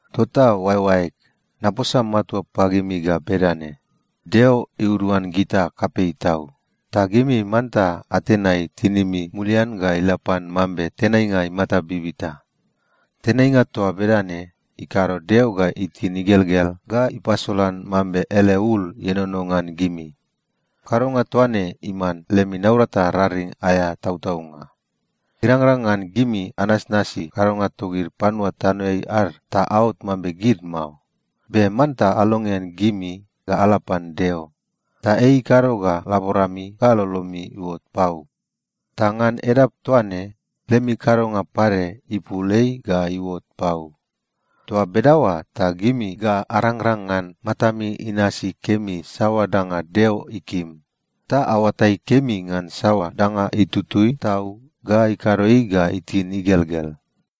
Tota oaeoaeg, naposa matua pagimi ga bedane: Deo iuduan gita kapei tau, ta gimi manta atenai tinimi mulian ga ila pan mambe tenainga imata bibita. Tenainga toa bedane ikado Deo ga itin igelgel ga ipasolan mambe ele ul ienono ngan gimi. Kadonga toa ne iman lemi naurata raring aea tautaunga. Irangrang ngan gimi anasnasi kadonga togid panua tanoeai ad ta aot mambe gid mao. Be manta alongean gimi ga ala pan Deo, ta ei ikado ga laborami ga lolomi iuot pau. Ta ngan edap toa ne, lemi kadonga pade ipul ei ga iuot pau. Toa bedaoa ta gimi ga arangrang ngan matami inasi kemi saoa danga Deo ikim, ta aoatai kemi ngan saoa danga itutui tau ga ikado ei ga itin igelgel.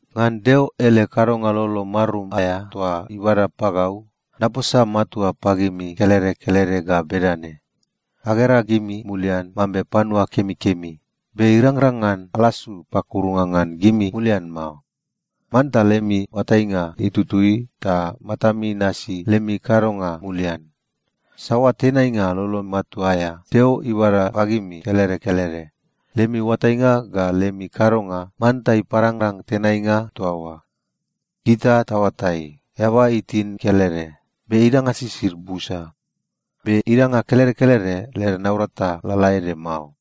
Ngan Deo ele kadonga lolo marum aea toa ibada pagau, naposa matua pagimi kelede kelede ga bedane: Agera gimi mulian mambe panua kemikemi, be irangrang ngan alasu pakurunga ngan gimi mulian mao. Manta lemi oatainga itutui ta matami inasi lemi kadonga mulian. Saoa tenainga lolo matua aea Deo ibada pagimi kelede kelede, lemi oatainga ga lemi kadonga manta iparangrang tenainga toa oa. Gita taoatai, eaba itin kelede, be idanga sisid busa. Be idanga kelede kelede led naurata lalaede mao.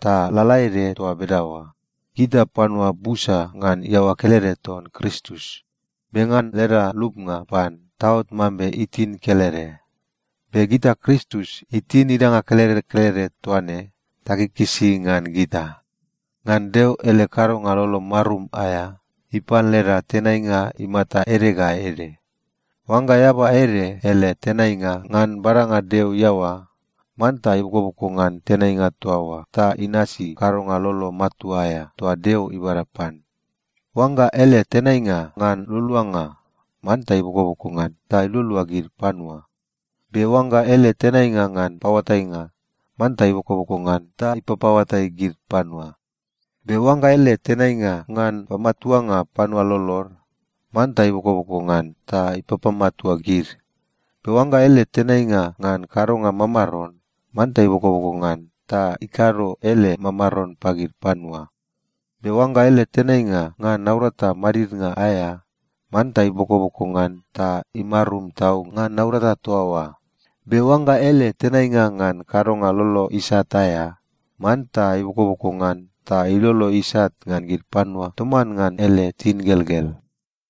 Ta lalaede toa bedaoa, gita panua busa ngan iaoa kelede ton Kristus, be ngan leda lupnga pan, taot mambe itin kelede. Be gita Kristus itin idanga kelede kelede toa ne, takikisi ngan gita. Ngan Deo ele kadonga lolo marum aea, ipan leda tenainga imata ede ga ede. Oangga eaba ede ele tenainga ngan badanga Deo iaoa, manta ibokoboko ngan tenainga toa oa ta inasi kadonga lolo matua aea toa Deo ibada pan. Oangga ele tenainga ngan lualuanga, manta ibokoboko ngan ta ilualua gid panua. Be oangga ele tenainga ngan paoatainga, manta ibokoboko ngan ta ipapaoatai gid panua. Be oangga ele tenainga ngan pamatuanga panua lolod, manta ibokoboko ngan ta ipapamatua gid. Be oangga ele tenainga ngan kadonga mamaron, manta ibokoboko ngan ta ikado ele mamaron pagid panua. Be oangga ele tenainga ngan naurata madidnga aea, manta ibokoboko ngan ta imarum tau ngan naurata toa oa. Be oangga ele tenainga ngan kadonga lolo isat aea, manta ibokoboko ngan ta ilolo isat ngan gid panua toman ngan ele tingelgel.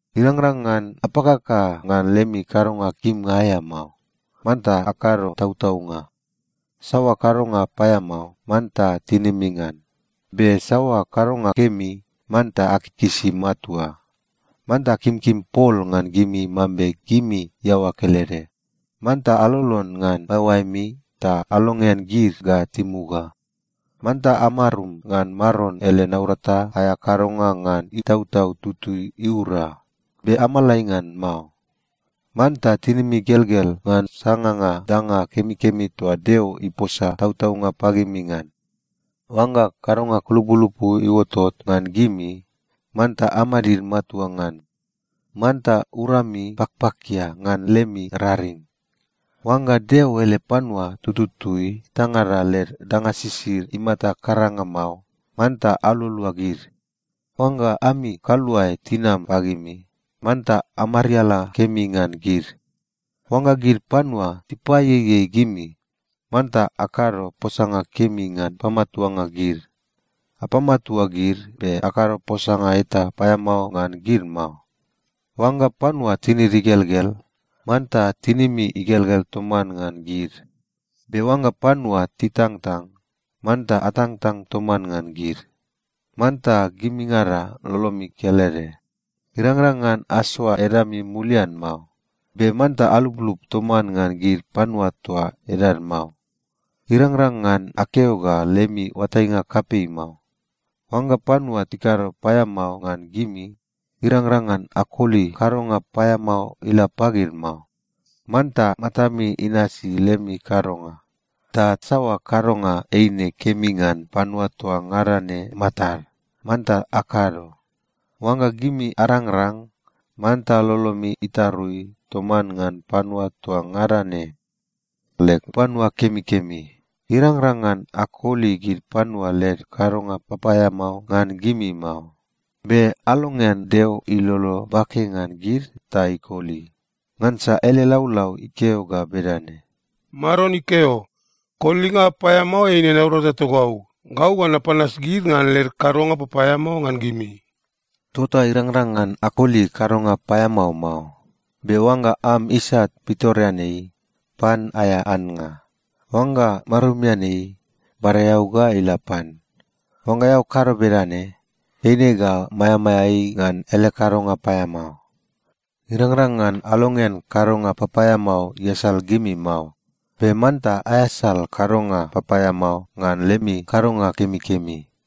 Irangrang ngan apakaka ngan lemi kadonga kimnga aea mao. Manta akado tautaunga. Saoa kadonga paeamao, manta tinimi ngan. Be saoa kadonga kemi, manta akikisi matua. Manta akimkim pol ngan gimi mambe gimi iaoa kelede. Manta alolon ngan oaeoaemi ta alongean gid ga timuga. Manta amarum ngan Maron ele naurata aea kadonga ngan Itautau Tutui iura, be amalai ngan mao. Manta tinimi igelgel ngan sanganga danga kemikemi toa Deo iposa tautaunga pagimi ngan. Oangga kadonga kulupulupu iuotot ngan gimi, manta amadid matua ngan. Manta urami pakpakia ngan lemi raring. Oangga Deo ele panua tututui etangada led danga sisid imata karanga mao, manta alualua gid. Oangga ami kaluae tinam pagimi, manta amariala kemi ngan gid. Oangga gid panua tipaieiei gimi, manta akado posanga kemi ngan pamatuanga gid. Apamatua gid, be akado posanga eta paeamao ngan gid mao. Oangga panua tinid igelgel, manta tinimi igelgel toman ngan gid. Be oangga panua titangtang, manta atangtang toman ngan gid. Manta gimingada lolomi kelede. Irangrang ngan asoa edami mulian mao, be manta aluplup toman ngan gid panua toa edad mao. Irangrang ngan akeo ga lemi oatainga kapei mao. Oangga panua tikado paeamao ngan gimi, irangrang ngan akoli kadonga paeamao ila pagid mao. Manta matami inasi lemi kadonga, ta saoa kadonga eine kemi ngan panua toa ngada ne matad, manta akado. Oangga gimi arangrang, manta lolomi itarui toman ngan panua toa ngada ne. Leg panua kemikemi, irangrang ngan akoli gid panua led kadonga papaeamao ngan gimi mao. Be alongean Deo ilolo bake ngan gid ta ikoli. Ngansa ele laulau ikeo ga bedane, “Maron ikeo, ‘Kolinga paeamao eine naurata togau. Gau ga napanas gid ngan led kadonga papaeamao ngan gimi.’” Tota irangrang ngan akoli kadonga paeamao mao. Be “oangga am isat pitoreanei, pan aea annga. Oangga marumian ei, bada eau ga ila pan. Oangga eao kado bedane, eine ga maeamaea ei ngan ele kadonga paeamao.” Irangrang ngan alongean kadonga papaeamao iasal gimi mao. Be manta aeasal kadonga papaeamao ngan lemi kadonga kemikemi.